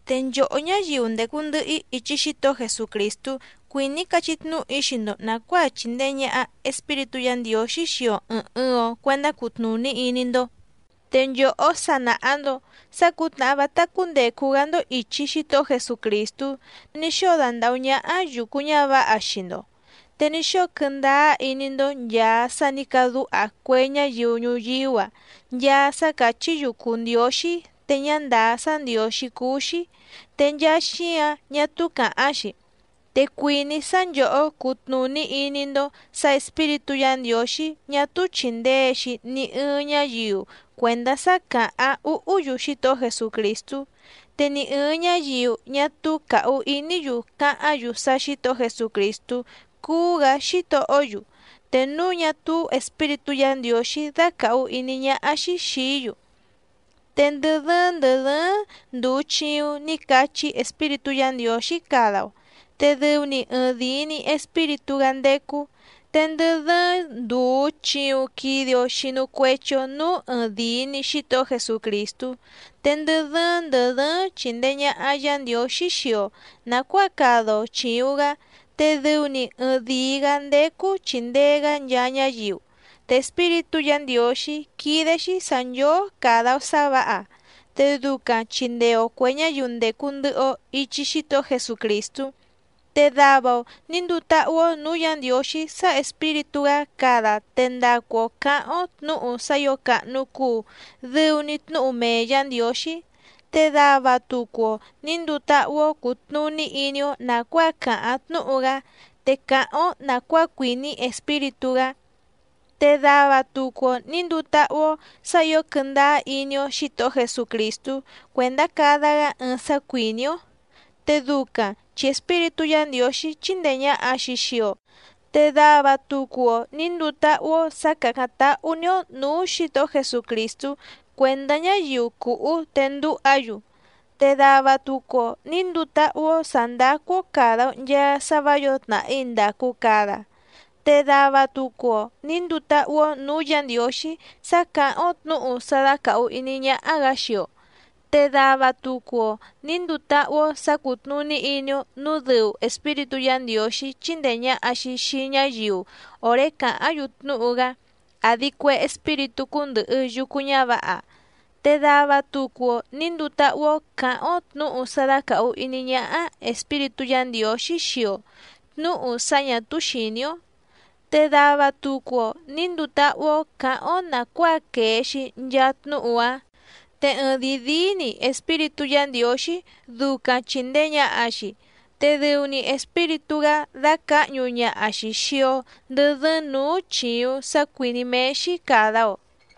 Te nchòhó ñáyiu ndècu ndɨhɨ‑í ichi Xítohó Jesucrìstú cuìní‑í cachí tnúhu‑í xii‑ndo nàcuáa chìndee ñaha Espíritú Yǎ Ndiǒxí xii‑o ɨ̀ɨⁿ ɨɨⁿ‑o cuendá cutnùní iní‑ndó. Te nchòhó sa nàha‑ndo sá cǔtnàhá vátá cúndècu‑gá‑ndó ìchi Xítohó Jesucrìstú ní xóo dandàhú ñáhá yùcu ñávǎha xii‑ndo, te ní xóo quɨ́ndáá iní‑ndó nchàa sá nǐ cadúha cue ñáyiu ñuyíú‑a nchaa sá càchí‑yu cùu ndióxí te ñá ndàá sá ndiǒxí cúú‑xí, te nchaa xíǎⁿ ñá túú càháⁿ‑xi. Te cuìní‑í sá nchòhó cutnùní iní‑ndó sǎ Espíritú Yǎ Ndiǒxí ñá túú chìndee‑xi ni ɨɨⁿ ñáyiu cuèndá sá càháⁿ úhú‑yu Xítohó Jesucrìstú. Te ni ɨ̀ɨⁿ ñáyiu ñá túú càhu iní‑yu cáháⁿ‑yu sá Xǐtohó Jesucrìstú cúú‑gǎ Xítohó‑yu te núu ñá túú Espíritú Yǎ Ndiǒxí dácàhu iní ñáhá‑xí xìí‑yu. Te ndɨ dɨ́ɨ́ⁿ ndɨ̀ dɨ́ɨ́ⁿ ndùu chiuⁿ ní cachí Espíritú Yǎ Ndiǒxí cada‑o, te dɨu‑ni ɨɨⁿdìi‑ni Espíritú‑gá ndécú. Te ndɨ dɨ́ɨ́ⁿ ndùu chiuⁿ quide‑o xinu cuechi‑o núú ɨɨⁿdìi‑ni Xítohó Jesucrìstú. Te ndɨ dɨ́ɨ́ⁿ ndɨ̀ dɨ́ɨ́ⁿ chìndee ñaha Yá Ndiǒxí xii‑o nàcuáa cada‑o chìuⁿ‑gá, te dɨu‑ni ɨɨⁿ dìi‑gá ndécú chìndee‑gá nchaa ñáyiu. Te Espíritú Yǎ Ndiǒxí quídé‑xí sǎ nchóó càda‑o sá vǎha, te ducaⁿ chìndee‑o cue ñáyiu ndècu ndɨhɨ‑o ichi Xítohó Jesucrìstú. Te dava‑o nǐ nduu táhú‑ó nǔú Yǎ Ndiǒxí sá Espíritú‑gá cada te ndacu‑o cǎháⁿ‑ó tnǔhu sá ǐo càhnu cuu dɨu‑ni tnúhu mee Yǎ Ndiǒxí, te dava tucu‑o nǐ nduu táhú‑ó cùtnuní iní‑ó nàcuáa càháⁿ tnúhu‑gá te cáháⁿ‑ó nàcuáa cuìní Espíritú‑gá. Te dava tucu‑o nǐ nduu táhú‑ó sǎ ǐo quɨ́ndáá iní‑ó Xǐtohó Jesucrìstú cuèndá cada‑gá ɨɨⁿ sá cuìní‑ó, te ducaⁿ chi Espíritú Yǎ Ndiǒxí chíndèe ñaha‑xi xii‑o. Te dava tucu‑o nǐ nduu táhú‑ó sǎ càcáⁿ táhú‑ní‑ó nǔú Xǐtohó Jesucrìstú cuèndá ñáyiu cùhú te ndúha‑yu. Te dava tucu‑o nǐ nduu táhú‑ó sǎ ndácú‑ó càda‑o nchaa sá vǎ yǒo tnàhí ndàcu cada, te dava tucu‑o nǐ nduu táhú‑ó nǔú Yǎ Ndiǒxí sá càháⁿ‑ó tnǔhu sá dácàhu iní ñáhá‑gǎ xii‑o, te dava tucu‑o nǐ nduu táhú‑ó sǎ cútnùní iní‑ó nǔu dɨu Espíritú Yǎ Ndiǒxí chíndèe ñaha‑xi xii ñáyiu òré càháⁿ‑yu tnúhu‑gá àdi cue espíritú cúndɨ̀hɨ yucu ñávǎha. Te dava tucu‑o nǐ nduu táhú‑ó cǎháⁿ‑ó tnǔhu sá dácàhu iní ñáhá Espíritú Yǎ Ndiǒxí xii‑o tnǔhu sá ñà túú xìní‑ó, te dava tucu‑o nǐ nduu táhú‑ó cǎháⁿ‑ó nàcuáa quèe‑xi nchaa tnúhu‑áⁿ. Te ɨɨⁿdìi díí‑ni Espíritú Yǎ Ndiǒxí ducaⁿ chìndee ñaha‑xi, te dɨu‑ni Espíritú‑gá dácǎhñu ñaha‑xi xìi‑o ndɨ dɨ́ɨ́ⁿ nǔú chìuⁿ sá cuìní méé‑xí càda‑o.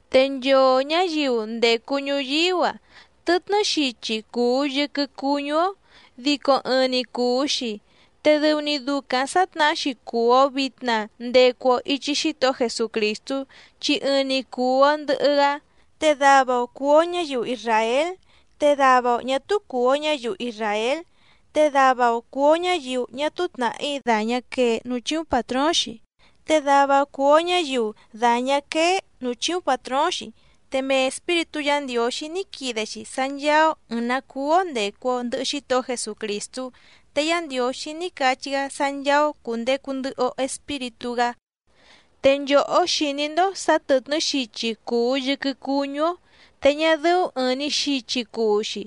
Te nchoo ñǎyiu ndècu ñuyíú‑a tɨtnɨ́ xichi cùu yɨquɨ cuñú‑ó dico ɨɨⁿ‑ni cùu‑xi, te dɨu‑ni ducaⁿ sǎtnahá‑xi cùu‑o vitna ndecu‑o ichi Xítohó Jesucrìstú chi ɨɨⁿ‑ni cùu‑o ndɨhɨ‑gá. Te dava‑o cùu‑o ñáyiu isràél, te dava‑o ñà túú cùu‑o ñáyiu isràél, te dava‑o cùu‑o ñáyiu ñá túú tnàhí dàñá quee núú chíúⁿ pàtróóⁿ‑xi, te dava‑o cùu‑o ñáyiu dàñá quéé nǔú chíúⁿ pàtróóⁿ‑xi. Te mee Espíritú Yǎ Ndiǒxí ní quide‑xi sá ncháá‑ó ɨ̀ɨⁿ‑ná cúú‑ó ndècu‑o ndɨhɨ Xítohó Jesucrìstú. Te Yá Ndiǒxí ní cachí‑gá sá ncháá‑ó cùndecu ndɨhɨ‑o Espíritú‑gá. Te nchòhó xìní‑ndó sǎ tɨ̀tnɨ́ xichi cùu yɨquɨ cuñú‑ó te ñá dɨ́ú ɨ̀ɨⁿ‑ni xichi cuu‑xi.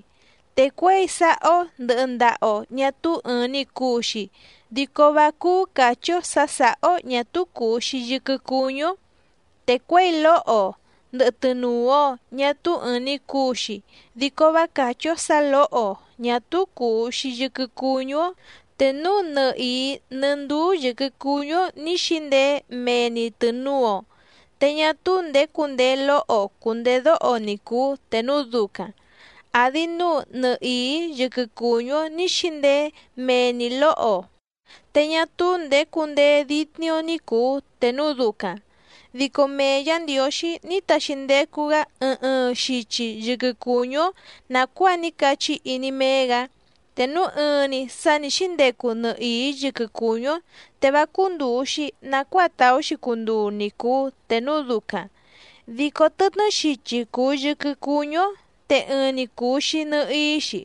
Te cuěi sáhá‑ó ndɨ̀hɨ ndaha‑o ñá túú ɨ̀ɨⁿ‑ni cuu‑xi dico vá cúú càchí‑ó sǎ sǎhá‑ó ñà túú cùu‑xi yɨquɨ cuñú‑ó. Te cuěi lóho‑o ndɨ̀hɨ tɨnuu‑o ñá túú ɨ̀ɨⁿ‑ni cuu‑xi dico vá càchí‑ó sǎ lǒho‑o ñà túú cùu‑xi yɨquɨ cuñú‑ó. Te núu nɨhìí nɨ́ ndúú yɨ̀quɨ cuñú‑ó ní xǐndeé mee‑ni tɨ̀nuu‑o, te ñá túú ndèé cundeé lóho‑o cùndedóho ni cùu te núu ducaⁿ, àdi núu nɨhìí yɨquɨ cùñú‑ó ní xǐndeé mee‑ni lǒho‑o te ñá túú ndèé cundeé dítní‑ó ní cùu te núu ducaⁿ. Dico mee Yǎ Ndiǒxí ní taxi ndecu‑gá ɨɨⁿ ɨɨⁿ xichi yɨquɨ cùñú‑ó nàcuáa ní cachí iní méé‑gǎ. Te núu ɨɨⁿ‑ni sǎ ní xǐndecu nɨhìí yɨquɨ cùñú‑ó, te vá cúndùu‑xi nacuáa tàú‑xi cunduu ni cùu te núu ducaⁿ. Dico tɨtnɨ́ xichi cùu yɨquɨ cuñú‑ó, te ɨɨⁿ‑ni cùu‑xi nɨhií‑xi.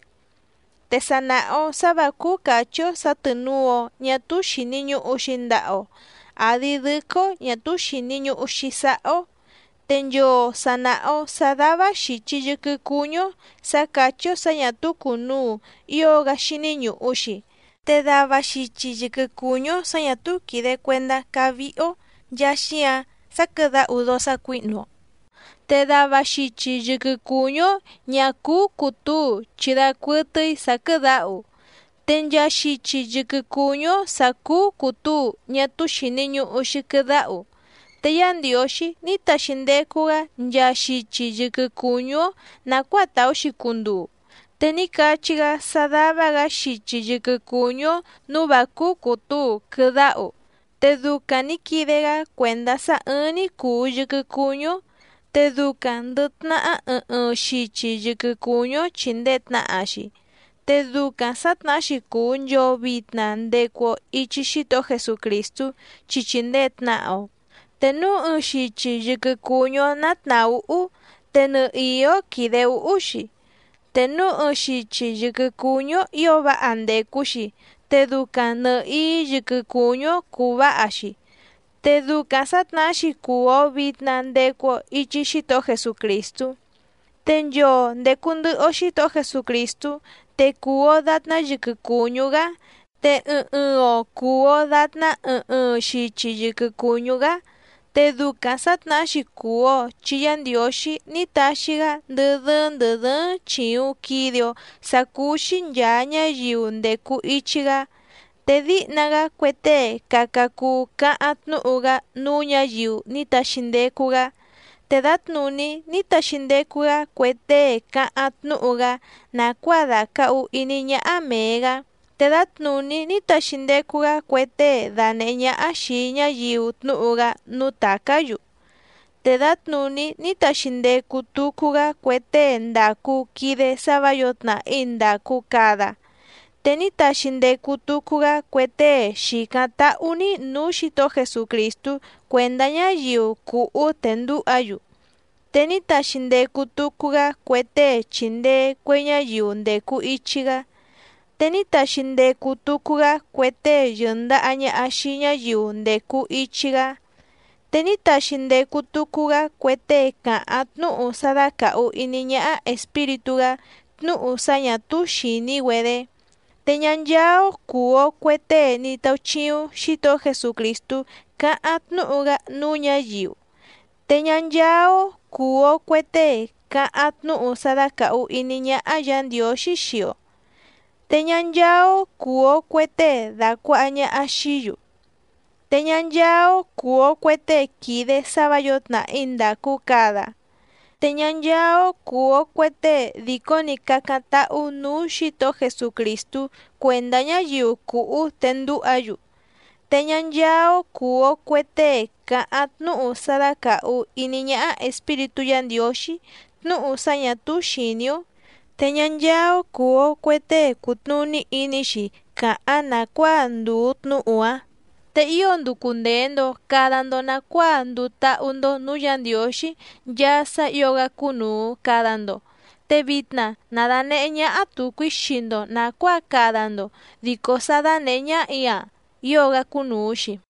Te sa nàha‑o sá vǎ cúú càchí‑ó sǎ tɨ̀nuu‑o ñá túú xìni ñuhu‑xi ndaha‑o, àdi dɨ́quɨ́‑ó ñà túú xìni ñuhu‑xi sáhá‑ó. Te nchoo sà naha‑o sá dává xìchi yɨquɨ cuñú‑ó sǎ càchí‑ó sǎ ñà túú cùnuu ío‑gá xíní ñùhu‑xi. Te dava xichi yɨquɨ cùñú‑ó sǎ ñà túú quìde cuendá cávíhí‑ó nchàa xíǎⁿ sá quɨ̀dáhu dóó sácuǐhnu‑o, te dava xichi yɨquɨ cùñú‑ó ñà cúú cùtúu chi dacuɨtɨ́í sǎ quɨ̀dáhu. Te nchaa xichi yɨquɨ cùñú‑ó sǎ cúú cùtúu ñá túú xìni ñuhu‑xi quɨdáhu. Te Yá Ndiǒxí ní taxi ndecu‑gá nchaa xichi yɨquɨ cùñú‑ó nàcuáa tàú‑xi cunduu. Te ní cachí‑gá sá dává‑gǎ xichi yɨquɨ cùñú‑ó nǔú vǎ cúú cùtúu quɨdáhu. Te ducaⁿ nǐ quide‑gá cuèndá sá ɨ́ɨ́ⁿ‑ní cùu yɨquɨ cuñú‑ó. Te ducaⁿ ndɨ̀ tnahá ɨɨⁿ ɨɨⁿ xichi yɨquɨ cùñú‑ó chìndee tnaha‑xi. Te ducaⁿ sǎtnahá‑xi cùu nchoo vitna ndecu‑o ichi Xítohó Jesucrìstú chi chìndee tnaha‑o. Te núu ɨɨⁿ xichi yɨquɨ cùñú‑ó ná tnàhúhú te nɨhìí‑ó quìde úhú‑xi, te núu ɨɨⁿ xichi yɨquɨ cùñú‑ó ǐo váha ndècu‑xi te ducaⁿ nɨ̀hií yɨquɨ cùñú‑ó cúú vǎha‑xi. Te ducaⁿ sǎtnahá‑xi cùu‑o vitna ndecu‑o ichi Xítohó Jesucrìstú. Te nchoo ndècu ndɨhɨ‑o Xítohó Jesucrìstú, te cùu‑o datná yɨquɨ cùñú‑gá te ɨɨⁿ ɨɨⁿ‑o cùu‑o datná ɨɨⁿ ɨɨⁿ xichi yɨquɨ cùñú‑gá. Te ducaⁿ sǎtnahá‑xi cùu‑o chi Yá Ndiǒxí ní taxi‑gá ndɨ́ dɨ́ɨ́ⁿ ndɨ̀ dɨ́ɨ́ⁿ chìuⁿ quide‑o sá cúú‑xí nchàa ñáyiu ndècu ichi‑gá. Te díhna‑gá cue tée caca cuu cáháⁿ tnúhu‑gá núú ñǎyiu ní taxi ndecu‑gá, te dǎtnùní ní taxi ndecu‑gá cue tée cáháⁿ tnúhu‑gá nàcuáa dàcahu iní ñáhá mèe‑gá, te dǎtnùní ní taxi ndecu‑gá cue tée dànehé ñáhá xìi ñáyiu tnúhu‑gá núú tàcá‑yu, te dǎtnùní ní taxi ndecu tucu‑gá cue tée ndàcu quide sá vǎ yǒo tnàhí ndàcu cada. Te ní taxi ndecu tucu‑gá cue tée xìcáⁿ táhú‑ní nǔú Xǐtohó Jesucrìstú cuèndá ñáyiu cùhú te ndúha‑yu. Te ní taxi ndecu tucu‑gá cue tée chìndee cue ñáyiu ndècu ichi‑gá. Te ní taxi ndecu tucu‑gá cue tée yɨ̀ndaha ñaha xii ñáyiu ndècu ichi‑gá, te ní taxi ndecu tucu‑gá cue tée càháⁿ tnúhu sá dácàhu iní ñáhá Espíritú‑gá tnúhu sá ñà túú xìní‑güedé. Te ñá ncháá‑ó cùu‑o cue tée ní táúchíúⁿ Xǐtohó Jesucrìstú cáháⁿ tnúhu‑gá núú ñǎyiu, te ñá ncháá‑ó cùu‑o cue tée càháⁿ tnúhu sá dácàhu iní ñáhá Yǎ Ndiǒxí xii‑o. Te ñá ncháá‑ó cùu‑o cue tée dàcuaha ñaha xií‑yu. Te ñá ncháá‑ó cùu‑o cue tée quìde sá vǎ yǒo tnàhí ndàcu cada. Te ñá ncháá‑ó cùu‑o cue tée dìcó‑ni cácáⁿ táhú nǔú Xǐtohó Jesucrìstú cuèndá ñáyiu cùhú te ndúha‑yu. Te ñá ncháá‑ó cùu‑o cue tée càháⁿ tnúhu sá dácàhu iní ñaha Espíritú Yǎ Ndiǒxí tnúhu sá ñà túú xìní‑ó, te ñá ncháá‑ó cùu‑o cue tée cùtnuní iní‑xi cáháⁿ nàcuáa ndùu tnúhu‑áⁿ. Te ío nducu ndèe‑ndo cada‑ndo nacuáa nduu táhú‑ndó nǔú Yǎ Ndiǒxí nchaa sá ǐo‑gá cúnùu cada‑ndo. Te vitna na dànehé ñáhá tùcu‑í xii‑ndo nàcuáa cada‑ndo, dico sá dánèhé ñáhà‑í‑a ío‑gá cúnùu‑xi.